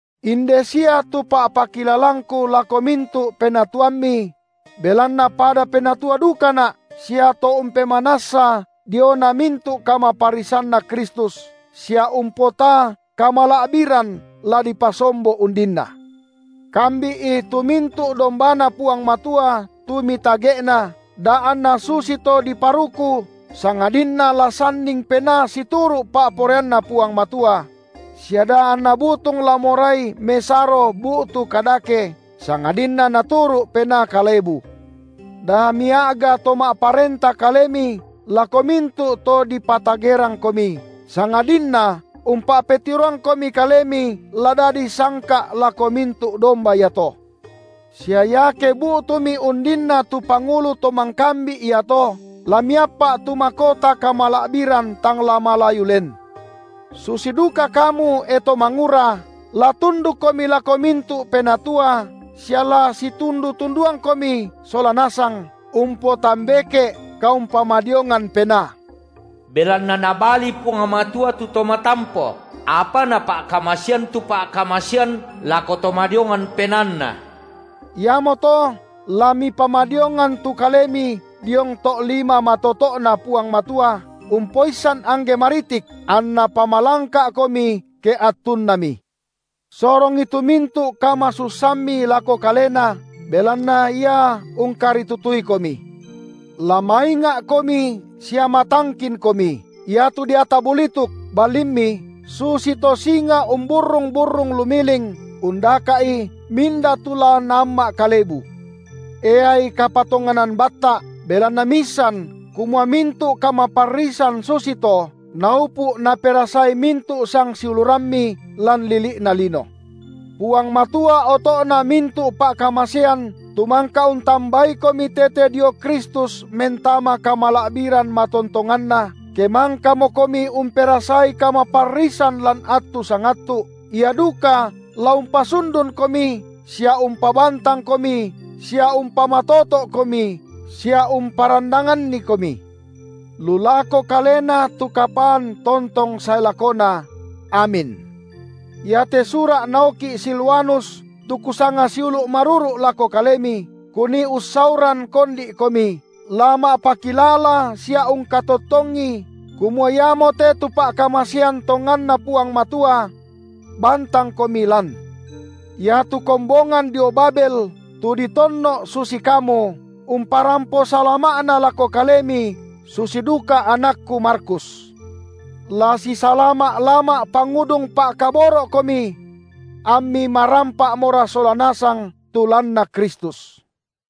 Inde sia tu pa’pakilalangku lako mintu’ penatuammi – belanna pada penatua dukana’ sia to umpemanassa diona mintu’ kamaparrisanNa Kristus, sia umpotaa kamala’biran la dipasombo undinna: – kambi’i tu mintu’ dombaNa Puang Matua tu mitage’na, da anna susito diparuku sangadinna la sanning penaa situru’ pa’poraianNa Puang Matua; sia da anna butung la morai mesaro bu’tu kadake, sangadinna naturu’ penaa kalebu; da mia’ga to ma’parenta kalemi lako mintu’ to dipatagerangkomi, sangadinna umpa’petiroangkomi kalemi la dadi sangka’lako mintu’ domba iato. Sia iake bu’tumi undinna tu Pangulu to mangkambi’ iato, la miappa’ tu makota kamala’biran tang la malayu len. Susi duka kamu, e to mangura, la tundukkomi lako mintu’ penatua sia la situndu-tunduangkomi sola nasang umpotambeke’ kaumpamadiongan penaa; belanna Nabali Puang Matua tu to matampo, apa Napa’kamasean tu pa’kamasean lako to madiongan penaanna. Iamoto la mipamadiongan tu kalemi diong to’ lima matoto’Na Puang Matua umpoissan angge maritik, anNa pamalangka’komi ke attunNami. Sorongi tu mintu’ kamasussammi lako Kalena, belanna Ia ungkaritutuikomi. La mainga’komi sia matangkinkomi; iatu deata bulituk, balimmi susito singa umburrung-burrung lumiling, undaka’i minda tu la naamma’ kalebu. Eai kapatonganan batta’, belanna miissan, kumua mintu’ kamaparrisan susito, naupu’ naperasai mintu’ sangsiulurammi lan lili’na lino. Salama’na rasulu’ Puang Matua oto’na mintu’ pa’kamasean tu mangka untambaikomi tete dio Kristus mentama kamala’biran matontonganNa, ke mangkamokomi umperasai kamaparrisan lan attu sangattu’, Ia duka la umpasundunkomi sia umpabantangkomi sia umpamatoto’komi sia umparandangannikomi. Lu lako Kalena tu kapaan tontong sae lakona! Amin. Iate sura’ naoki’ Silwanus tu kusanga siulu’ maruru’ lako kalemi, kunii ussauran kondi’komi, la ma’pakilala sia ungkatottongi, kumua iamote tu pa’kamasean tonganNa Puang Matua. Bantangkomi lan. Iatu kombongan dio Babel, tu ditonno’ susi kamu, umparampo salama’na lako kalemi, susi duka anakku Markus. La sisalama’-lama’ pangudung pa’koboro’komi. Ammi marampa’mora sola nasang tu lanna Kristus.